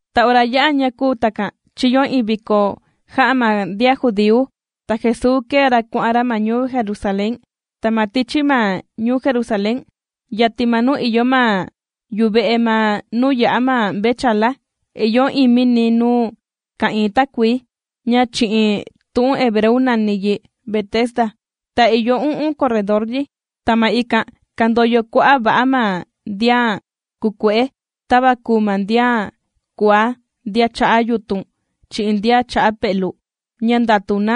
Ta ora ya'a ña kūu takan, chīyo iin viko jā'a ma ndian judíu, ta Jesuu kēe ra kuà'an ra ma ñuu Jerusalén. Ta ma tichi ma ñuu Jerusalén, yatin ma nuu ìyo ma yuve'e ma nuu yà'a ma mvechala, ìyo iin mini nuu ka'ìin takuii, ña chi'in tu'un hebreu nàni yi Betesda, ta ìyo u'un corredor yi. Ta ma ikan kàndoyo kua'a' va'a ma ndian kùkue'e, tava kùu ma ndian kuaá, ndian cha'a yutun chi'in ndian cha'a pe'lu, ña ndàtu na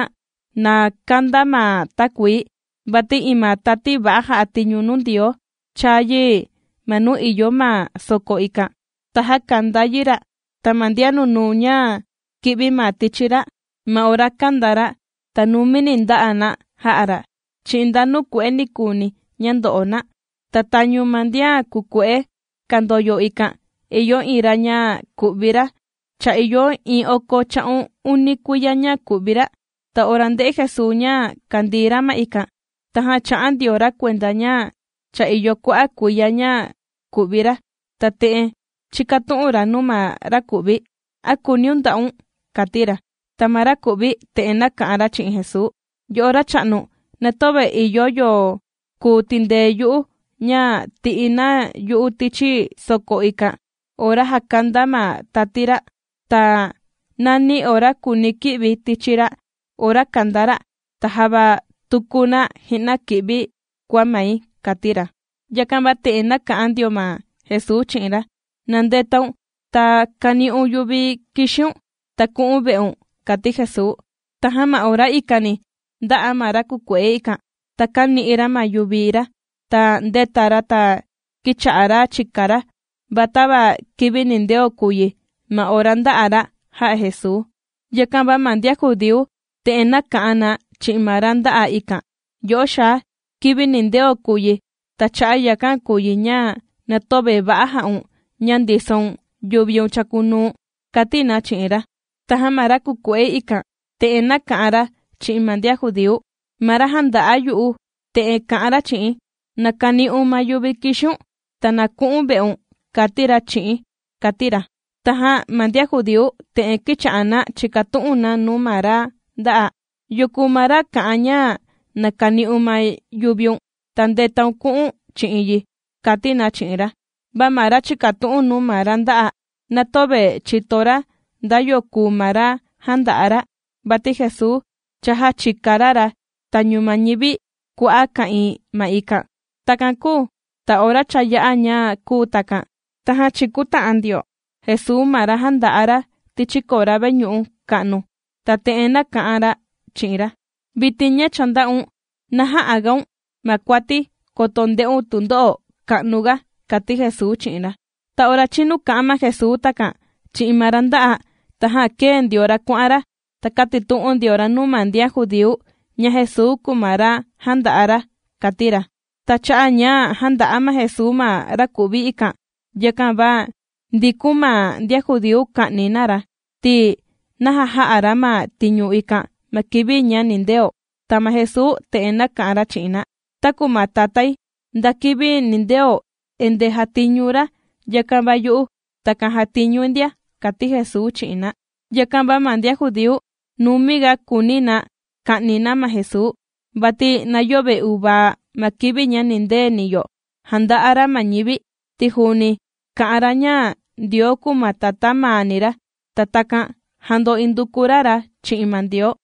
na kandaa ma takuii. Vati iin ma tati va'a jà'a tiñu nuu Ndioo chàa yi ma nuu ìyo ma soko ikan, ta jàkanda yi ra', ta ma ndian nunuu ña kì'vi ma tichi ra', ma ora kandaa ra', ta numini ndà'a na jà'a ra' chi'in nda nuu kue'e nikuuni ña ndo'o na. Ta tañu ma ndian kùkue'e kàndoyo ikan, ìyo iin ra ña ku'vi ra cha ìyo iin oko cha'un uni kuiya ña ku'vi ra. Ta ora ndē'e Jesuu ña kàndii ra ma ikan, tajan chā'a ndio ra kuenda ña cha ìyo kua'a' kuiya ña ku'vi ra, ta te'en chīkatu'un ra nuu ma ra kù'vi: ―¿A kùuniun nda'un? ―kàti ra. Ta ma raku'vi te'en nāka'an ra chi'in Jesuu: ―Yo'o racha'nu, na töve ìyo yo kuu tindee yu'u ña tì'i na yu'u tichi soko ikan ora jàkanda ma tati ra'. Ta nàni ora kùuni̱ ki'vi tichi ra' ora kandaa ra', ta java tuku na ji'na kì'vi kua mai ―kàti ra. Yakan va te'en nāka'an ndio ma Jesuu chi'in ra: ―Na ndetaun ta kani'un yuvi kìxiun ta ku'u̱n ve'un ―kàti Jesuu. Tajan ma ora ikani ndā'a ma ra kùkue'e ikan, ta kāni'i ra ma yuvi ra, ta ndēta ra ta kīcha'a ra chìka ra. Va tava kivi nindeo kùu yi ma ora ndā'a ra jà'a Jesuu, yakan va ma ndian judíu, te'en nāka'an na chi'in ma ra ndā'a ikan: ―Yo'o xaa, kivi nindeo kùu yi, ta cha'a' yakan kùu yi ña na töve va'a jà'un ña ndisoun yuviun chàkunuu̱n ―kàti na chi'in ra. Tajan ma ra kùkue'e ikan, te'en nāka'an ra chi'in ma ndian judíu: ―Ma ra jānda'a yu'u te'en kā'an ra chi'i̱n: “Na kani'un ma yuvi kìxiun ta na ku'u̱n ve'un”, kāti ra chi'i̱n ―kàti ra. Tajan ma ndian judíu te'en kīcha'a na chìkatu'un na nuu ma ra ndā'a. ―¿Yo kùu ma ra kā'an ña na kani'un ma yuviun, ta ndètaun ta kù'u̱n chi'in yi? ―kàti na chi'in ra. Va ma ra chìkatu'un nuu ma ra ndā'a, na töve chìto ra nda yo kùu ma ra jānda'a ra, vati Jesuu cha jāchika ra ra tañu ma ñivi kua'a' ka'ìin ma ikan. Takan kūu ta ora cha ya'a ña kūu takan, tajan chīkuta'an ndio Jesuu ma ra jānda'a ra tichi kora veñu'u ka'nu, ta te'en nāka'an ra chi'in ra: ―Vitin ña cha ndā'un, na jä'a gaun ma kuati, koto nde'un tundo'o ka'nu ga ―kàti Jesuu chi'in ra. Ta ora chīnu kā'an ma Jesuu takan chi'in ma ra ndā'a, tajan kēe ndio ra kuà'an ra, ta kātitu'un ndio ra nuu ma ndian judíu ña Jesuu kùu ma ra jānda'a ra, kàti ra. Ta cha'a' ña jānda'a ma Jesuu ma ra ku'vi ikan, yakan va ndīkun ma ndian judíu ka'ni na ra, ti naja jā'a ra ma tiñu ikan ma kivi ña nindeo. Ta ma Jesuu te'en nāka'an ra chi'in na: ―Taku ma Tatái nda kivi nindeo endeeni jàtiñu ra, yakan va yu'u takan jàtiñui ndia ―kàti Jesuu chi'in na. Yakan va ma ndian judíu numiga kùuni na ka'ni na ma Jesuu, vati na yöve uvaa ma kivi ña nindeni yo jànda'a ra ma ñivi, ti juuni kà'an ra ña Ndioo kùu ma Tatá maani ra, ta takan jando induku ra ra chi'in ma Ndioo.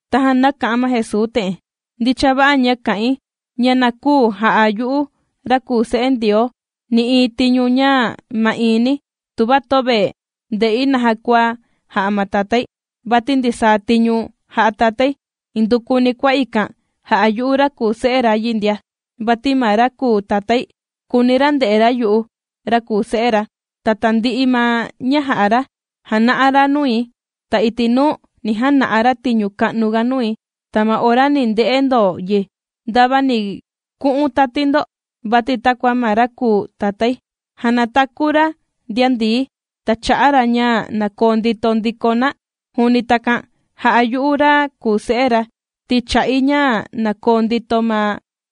Tajan nāka'an ma Jesuu te'en: ―Ndicha va'a ña kà'in, ña na küu ja'a yu'u ra kùu Se'e Ndioo nï'iin tiñu ña ma'iin ni, tuva töve ndē'i naja kua jà'a ma Tatái. Vati ndisaa tiñu jà'a Tatái, indukuni kua ikan jà'a yu'u ra kùu Se'e ra yi ndia. Vati ma ra kùu Tatái kùuni ra nde'e ra yu'u ra kùu Se'e ra, ta tandi'i ma ña jà'a ra jàna'a ra nui. Ta iti' nuu, ni jana'a ra tiñu ka'nuga nui, ta ma ora ni nde'e ndo yi ndava ni ku'un tati ndo. Vati takua ma ra kùu Tatái jànataku ra ndian ndií, ta chà'a ra ña na koo ndito ndiko na, juuni takan jà'a yu'u ra kùu Se'e ra, ti chà'i ña na koo ndito ma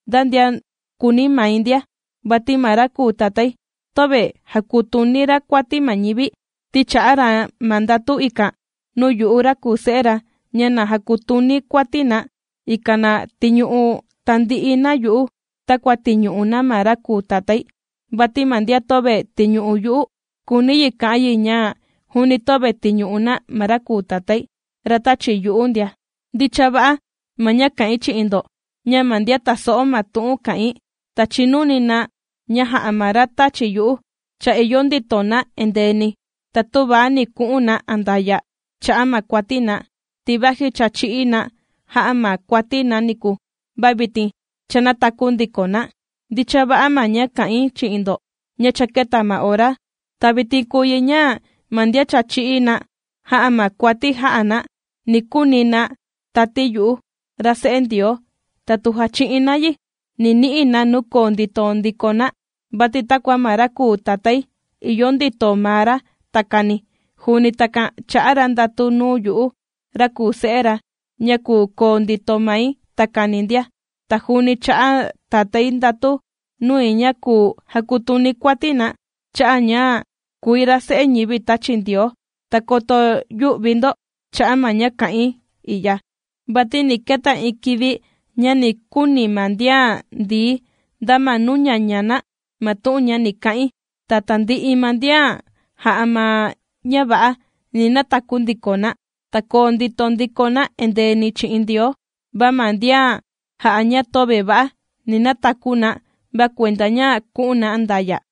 nda ndian kùuni mai ndia. Vati ma ra kùu Tatái töve jàkutuni ra kuati ma ñivi, ti chā'a ra ma ndatu ikan nuu yu'u ra kùu Se'e ra ña na jakutuni̱ kuati na, ikan na tiñu'u tandi'i na yu'u takua tìñu'u na ma ra kùu Tatái. Vati ma ndian töve tìñu'u yu'u, kùuni yi kà'an yi ña juuni töve tìñu'u na ma ra kùu Tatái, ra tāchi yu'u ndia. ’Ndicha va'a, ma ña kà'in chi'in ndo, ña ma ndian tàso'o ma tu'un kà'in, ta chìnuni na ña jà'a ma ra tāchi yu'u, cha ìyo ndito na endeeni, ta töva ni ku'un na andaya' cha'a' ma kuati na, ti vaji cha chī'í na jà'a ma kuati na niku, va vitin cha nātaku ndiko na. Ndicha va'a, ma ña kà'in chi'in ndo ña cha kēta ma ora, ta vitin kùu yi ña ma ndian cha chī'í na jà'a ma kuati jā'a na, ni kuni na tati yu'u, ra Se'e Ndioo, ta tu jachi'in na yi, ni ni'i na nuu koo ndito ndiko na. Vati takua ma ra kùu Tatái ìyo ndito maa ra takani, juuni takan chā'a ra ndatu nuu yu'u ra kùu Se'e ra ña kùu koo ndito mai takani ndia. Ta juuni chā'a Tatái ndatu nui ña kùu jakutuni̱ kuati na, cha'a' ña kùi ra Se'e ñivi tāchi Ndioo. Ta koto yü'vi ndo cha'a' ma ña kà'in i'ya, vati ni keta iin kivi ña ni kuni ma ndian ndií nda ma nuu ñaña na ma tu'un ña ni ka'in. Ta tandi'i ma ndian jā'a ma ña va'a, ni nataku ndiko na, ta koo ndito ndiko na endeeni chi'in Ndioo, va ma ndian jā'a ña töve va'a, ni nataku na, va kuenda ña ku'un na andaya'.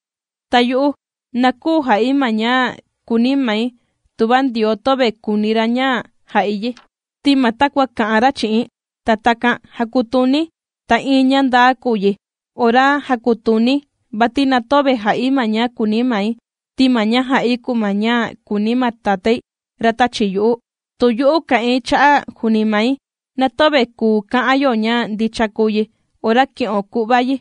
’Ta yu'u na küu ja'i ma ña kùuni mai tuva Ndioo töve kùuni ra ña jà'i yi, ti ma takua kà'an ra chi'i̱n, ta takan jàkutuni̱. Ta iin ña ndaa kùu yi ora jàkutuni̱, vati na töve jà'i ma ña kùuni mai, ti ma ña jà'i kùu ma ña kùuni ma Tatái ra tāchi yu'u. Tu yu'u kà'in cha'a' juuni mai, na töve kùu ka'an yo ña ndicha kùu yi ora ki'o ku'va yi.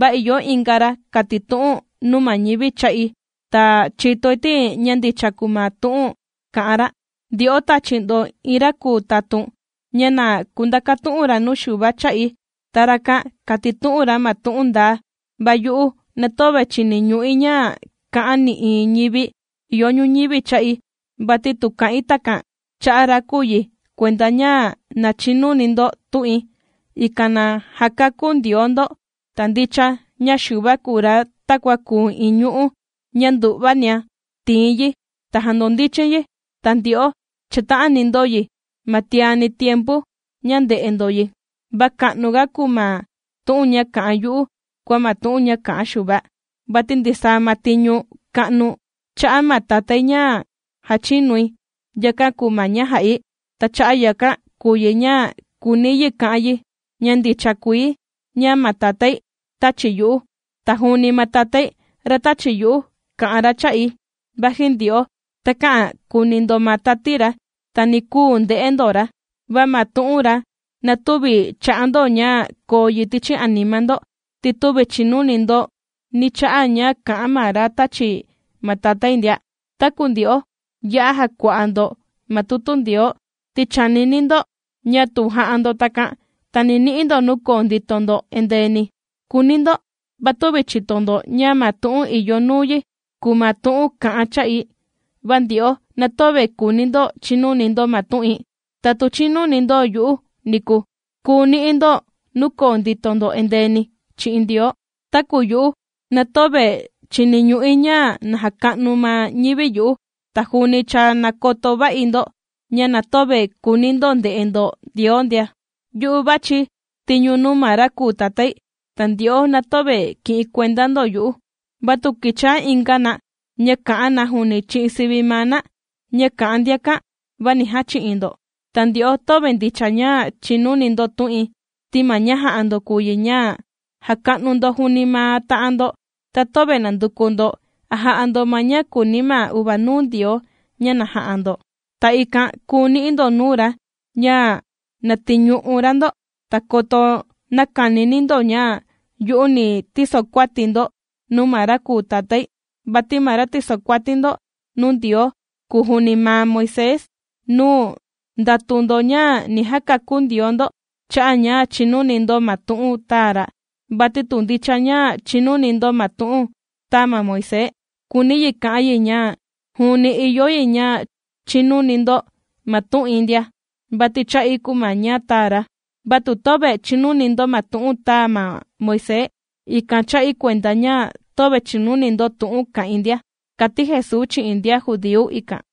Va ìyo inga ra kàtitu'un nuu ma ñivi cha'i, ta chìtoi ti ña ndicha kùu ma tu'un kà'an ra. Ndyo'o tāchi ndo iin ra kùu tatun ña na kundakatu'un ra nuu Xuva cha'i. Ta rakan kātitu'un ra ma tu'un ndaa. Va yu'u na töve chìniñu'i ña kà'an nï'iin ñivi ìyo ñuñivi cha'i. Vati tu kà'in takan chà'a ra kùu yi kuenda ña na chinuni ndo tu'in, ikan na jakakú Ndioo ndo. Ta ndicha ña Xuva kùu ra takua kùu iin ñu'ú ña ndu'vania tìin yi ta jàndondichin yi. Ta ndyo'o chàta'ani ndo yi ma tiani tiempu ña ndē'e ndo yi. Va ka'nuga kùu ma tu'un ña kà'an yu'u kua ma tu'un ña kā'an Xuva. Vati ndisaa ma tiñu ka'nu chā'a ma Tatái ña jàchinui, yakan kùu ma ña jà'i. Ta cha'a' yakan kùu yi ña kùuni yi ka'an yi, ña ndicha kuii ña ma Tatái tāchi yu'u. Ta juuni ma Tatái ra tāchi yu'u, kā'an ra cha'i, vaji ndyo'o takä'an kuni ndo ma tati ra, ta ni küu nde'e ndo ra. Va ma tu'un ra na tüvi chà'a ndo ña koo yi tichi anima ndo, ti tüvi chìnuni ndo nī cha'a ña kà'an ma ra tāchi ma Tatái ndia. Taku ndyo'o, ya'a jàkua'a ndo ma tutu Ndioo, ti chànini ndo ña tu jà'a ndo takan, ta ni ni'i ndo nuu koo ndito ndo endeeni kùuni ndo, va tüvi chìto ndo ña ma tu'un ìyo nuu yi kùu ma tu'un kà'an cha'i. Va ndyo'o na töve kùuni ndo chinuni ndo ma tu'in, ta tu chīnuni ndo yu'u niku, kùu ni'i ndo nuu koo ndito ndo endeeni chi'in Ndioo. ’Taku yu'u na töve chìniñu'i ña na jàka'nu ma ñivi yu'u. Ta juuni cha nàkoto va'i ndo, ña na töve kùuni ndo nde'e ndo Ndioo ndia. Yu'u vàchi̱ tiñu nuu ma ra kùu Tatái, ta ndyo'o na töve kì'in kuenda ndo yu'u. Va tu kìchaa inga na ña kà'an na juuni chi'in sivi maa na, ña kà'an ndiakan, va ni jachi'in ndo. Ta ndyo'o töve ndicha ña chìnuni ndo tu'in, ti ma ña jà'a ndo kùu yi, ña jàka'nu ndo juuni ma ta'an ndo, ta töve nànduku ndo a jà'a ndo ma ña kùuni ma uvanuu Ndioo ña na ja'a ndo, ta ikan kùu ni'i ndo nuu ra ña na tìñu'u ra ndo. Ta koto näkanini ndo ña yu'u ni tisokuati̱ ndo nuu ma ra kùu Tatái, vati ma ra tìsokuati ndo nuu Ndioo kùu juuni ma Moisés, nuu ndàtu ndo ña ni jakakú Ndioo ndo cha'a' ña chìnuni ndo ma tu'un tāa ra. Vati tu ndicha ña chìnuni ndo ma tu'un tāa ma Moisés, kùuni yi ka'an yi ña juuni ìyo yi ña chinuni ndo ma tu'in ndia, vati cha'i kùu ma ña tāa ra. Va tu töve chìnuni ndo ma tu'un tāa Moisés, ikan chà'i kuenda ña töve chìnuni ndo tu'un kà'in ndia ―kàti Jesuu chi'in ndian judíu ikan.